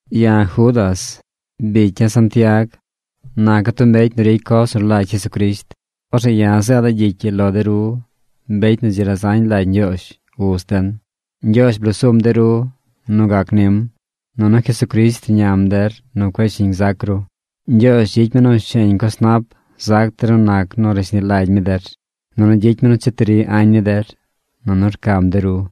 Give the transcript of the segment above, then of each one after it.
Ya̱ Judas, bicya̱ Santiag, naca̱ tub mbecy nu ricy coz nu rlagy Jesucrisht. Orzeꞌ ya̱ zeeda̱ gyicy ii lo de ru mbecy nu dzi razañ lagy Ñgyoozh, Uz den. Ñgyoozh blosum de ru nu gac nim. Nunu Jesucrisht rñam der nu cueꞌ shiñ zac ru. Ñgyoozh gyicy mi nu sheñ coz nap zac der nu nac nu rashni lagy mi der, nunu gyicy mi nu cheti ri añ ni der, nunu rcam de ru.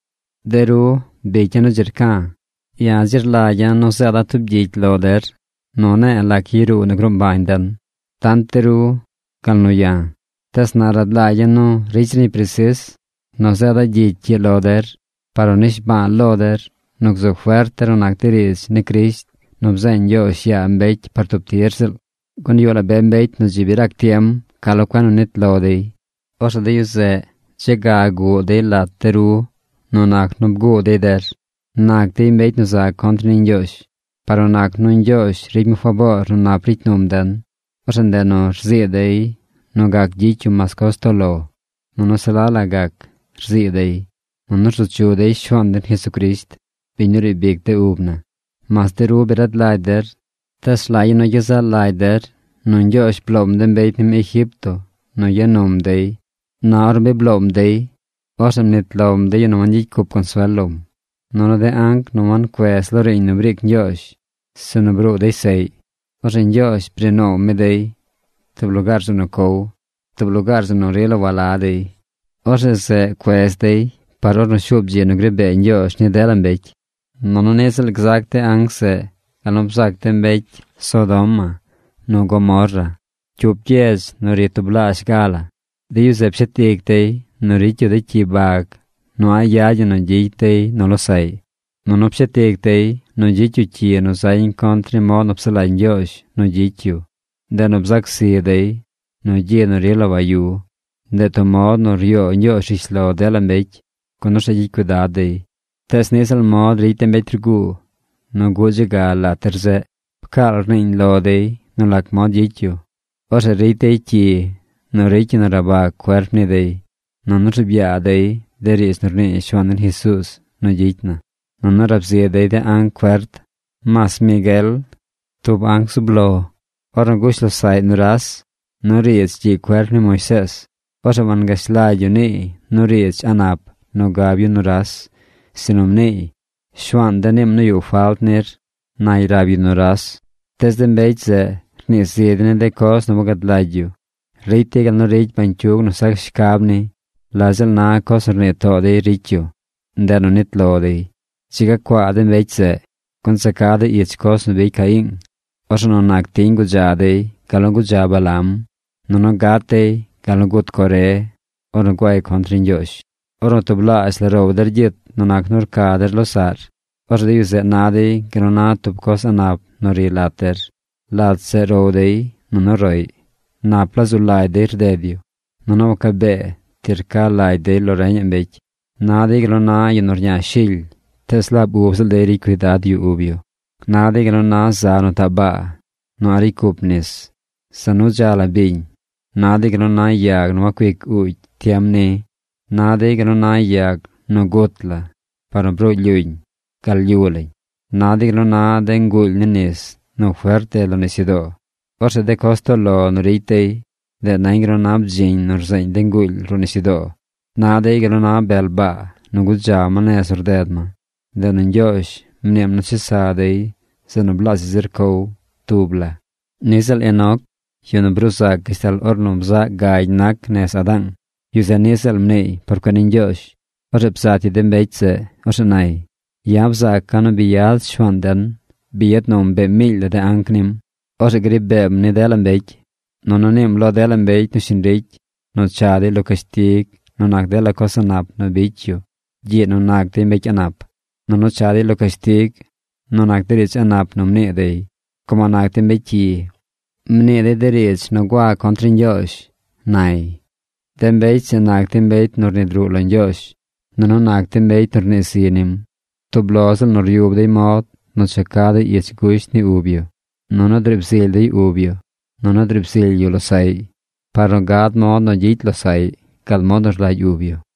De ru, bicya̱ nu dzi rca̱, ya̱ dzi rlagya̱ nu zeeda̱ tub gyicy lo der nu rne̱e̱ lac yaruu nu gruu mbañ den: tant de ru, gal nu ya̱. Tees na rad lagya̱ nu ricy zir ñi presis nu zeeda̱ gyicy ii lo der par nu nishba̱a̱ lo der nu gzu fert der nu nac de riidz ni Crisht nu bzeeñ Ñgyoozh yaa mbecy par tub tir ziꞌl. Gun yuꞌ la be mbecy nu dzi bi rac tiem ca lo cuen nu nit lo dey. Orzeꞌ de yu zeꞌ dze ga guꞌ dey lat de ru nu nac nu bguu dey der. Nac dey mbecy nu za contr ni Ñgyoozh. Par nu nac nu Ñgyoozh ricy mi faboor nu nap ricy num den, orzeꞌ ndeꞌ nu rzii dey nu gac gyicy yu mas coz toꞌ lo, nunu se la la gac, rzii dey. Nunu rzu chu dey Shuaan den Jesucrisht, biñ nu riib ic de ub na. Mas de ru bi rad lagy der, tees rlagya̱ nu gyezaꞌ lagy der nu Ñgyoozh bloom de mbecy nim Egipto nu ya num dey par Israeel. Na ornu bi bloom dey, orzeꞌ mnit lom de yu nu wangyicy cup consuel lom. Nunu de anc nu wancuez lo riiñ nu briic Ñgyoozh, sinu bruu dey seꞌy, orzeꞌ Ñgyoozh bri noow mi dey tub lugaar zeꞌ nu cow, tub lugaar zeꞌ nu rila wala dey. Orzeꞌ zeꞌ cuez dey par ornu shuub dzi nu gri bee Ñgyoozh ni dela mbecy. Nunu niꞌ ziꞌl gzac de anc zeꞌ gal nu bzac de mbecy Sodoma nu Gomorra, cyup gyedz nu ri tublaazh ga la. De yu zeꞌ pshet ic dey nu ricy yu de cyi bag nu a̱ꞌ yad ñi nu gyicy dey nu losaꞌy, nunu pshet ic dey nu gyicy yu cyi nu zañ contr ni mod nu psaꞌ lagy Ñgyoozh nu gyicy yu. Ndeꞌ nu bzac zi dey nu gyi nu rila wayu. Ndeꞌ tub mod nu ryoo Ñgyoozh rishlo dela mbecy, gun orzeꞌ gyicy cuidad dey. Tees niꞌ ziꞌl mod ricy de mbecy rguu nu guꞌ dze ga lat der zeꞌ. Pcaal rniiñ lo dey nu lac mod gyicy yu. Orzeꞌ ricy dey cyi nu ricy ñi nu rabag cuerp ni dey. Nunu rzuub yaa dey de riidz nu rnii Shuaan den Jesuuz nu gyicy na. Nunu rab zi dey de anc fert. Mas Miguel, tub anc zub lo, ornu gush losaꞌy nuras nu riidz gyiꞌ cuerp ni Moisees, orzeꞌ wangash lagy yu niiy nu riidz a̱ꞌ nap nu gab yu nuras, sinu mniiy: “Shuaan de̱ niim nu yuꞌ falt nir”, nay rab yu nuras. Tees de mbecy zeꞌ rnii zi dey ni de coz nu wagad lagy yu. Ricy dey gal nu ricy bañcyug nu sac shcab ni. La ziꞌl na coz nu rnii too dey ricy yu. Ndeꞌ nu nit lo dey. ¡Dzi ga cuaa de mbecy zeꞌ! Gun za ca dey ich coz nu bicy Caiing. Orzeꞌ nu nac tiñ gudza dey gal nu gudza Balaam. Nunu gat dey gal nu gut Coré ornu guay contr ni Ñgyoozh. Ornu tublaazh la row der gyit nu nac nu rca der losaꞌr, orzeꞌ de yu zeꞌ na dey gal nu na tub coz a̱ꞌ nap nu ri lat der. Lat zeꞌ row dey nunu roꞌy. Nap la zu lagy dey rded yu. Nunu waca bee ti rca lagy dey lo reñaꞌ mbecy. Na dey gal nu na yu nu rña shily, tees laab ub ziꞌl dey ricy cuidad yu ub yu. Na dey gal nu na za nu taꞌ baa nu a̱ꞌ ricy cup nis. Za nu dza la biñ. Na dey gal nu na yag nu wacuic uugy tiem ni. Na dey gal nu na yag nu gut la par nu bruu lyuñ gal lyu lañ. Na dey gal nu na de nguuly ni nis nu fert rded lo nisyudoo. Orzeꞌ de coz toꞌ lo nu ricy dey, ndeꞌ nañ gal nu na bdziñ nu rzeeñ de nguuly ruꞌ nisyudoo. Na dey gal nu na bel baa nu gudza ma nez nu rded ma. Ndeꞌ nu Ñgyoozh mniim nu chesa dey zeꞌ nu blaazhaꞌ zir cow tub la. Niꞌ ziꞌl Enoc, yu nu bruu zac gashtal ornu bzaꞌ gagy nac nez Adaang, yu zeꞌ niꞌ ziꞌl mniiy por cuen ni Ñgyoozh. Orzeꞌ bzat yu de mbecy zeꞌ. Orzeꞌ nay: “Ya̱ bzaaca̱ nu bi yad Shuaan den. Bi yad num be miily la de anc nim. Orzeꞌ gri beem ni dela mbecy. Nunu niim lo dela mbecy nu shiñ ricy nu cha dey lo cashtig nu nac dela coz a̱ꞌ nap nu bicy yu gyiꞌ nu nac dey mbecy a̱ꞌ nap. Nunu cha dey lo cashtig nu nac de riidz a̱ꞌ nap nu mnii dey, como nac dey mbecy cyi. Mnii dey de riidz nu gua contr ni Ñgyoozh”, nay. De mbecy zeꞌ nac dey mbecy nu rnid ruꞌ lo Ñgyoozh. Nunu nac dey mbecy nu rnii zi nim. Tub lo ziꞌl nu ryub dey mod nu cha ca dey ich gusht ni ub yu. Nunu driib zily dey ub yu. Nunu driib zily yu losaꞌy par nu gad mod nu gyicy losaꞌy gal mod nu rlagy ub yu.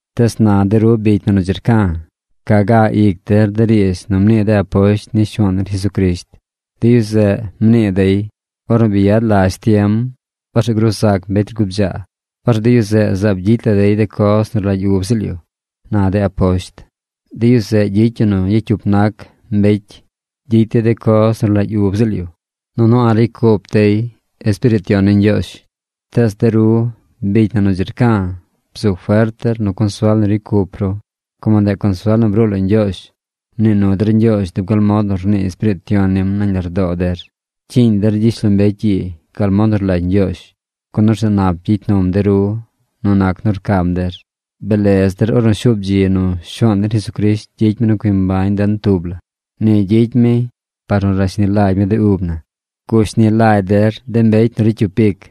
Tees na de ru bicy na nu dzi rca̱, ca ga ic der de riidz nu mnii de aposht ni Shuaan den Jesucrisht. De yu zeꞌ mnii dey: “Ornu bi yad lazh tiem, orzeꞌ gruu zac mbecy rgubdzaa. Orzeꞌ de yu zeꞌ zaab gyicy la dey de coz nu rlagy ub ziꞌl yu”, na de aposht. De yu zeꞌ gyicy yu nu gyacyup nac mbecy. Gyicy dey de coz nu rlagy ub ziꞌl yu. Nunu a̱ꞌ ricy cup dey Espiriit Yon ni Ñgyoozh. Tees de ru, bicy na nu dzi rca̱, bzu fert der nu consuel nu ricy cup ru, como ndeꞌ consuel nu bruu lo Ñgyoozh. Mnii nu der Ñgyoozh dub gal mod nu rnii Espiriit Yon nim nañ lardoo der. Pcyiiñ der gyishlombecy ii gal mod nu rlagy Ñgyoozh, gun orzeꞌ nap gyicy num de ru nu nac nu rcam der. Blez der ornu shuub dzi nu Shuaan den Jesucrisht gyicy mi nu cui mbañ den tub la. Ni gyicy mi par nu rashni lagy mi de ub na. Gushni lagy der de mbecy nu ricy cyup ic.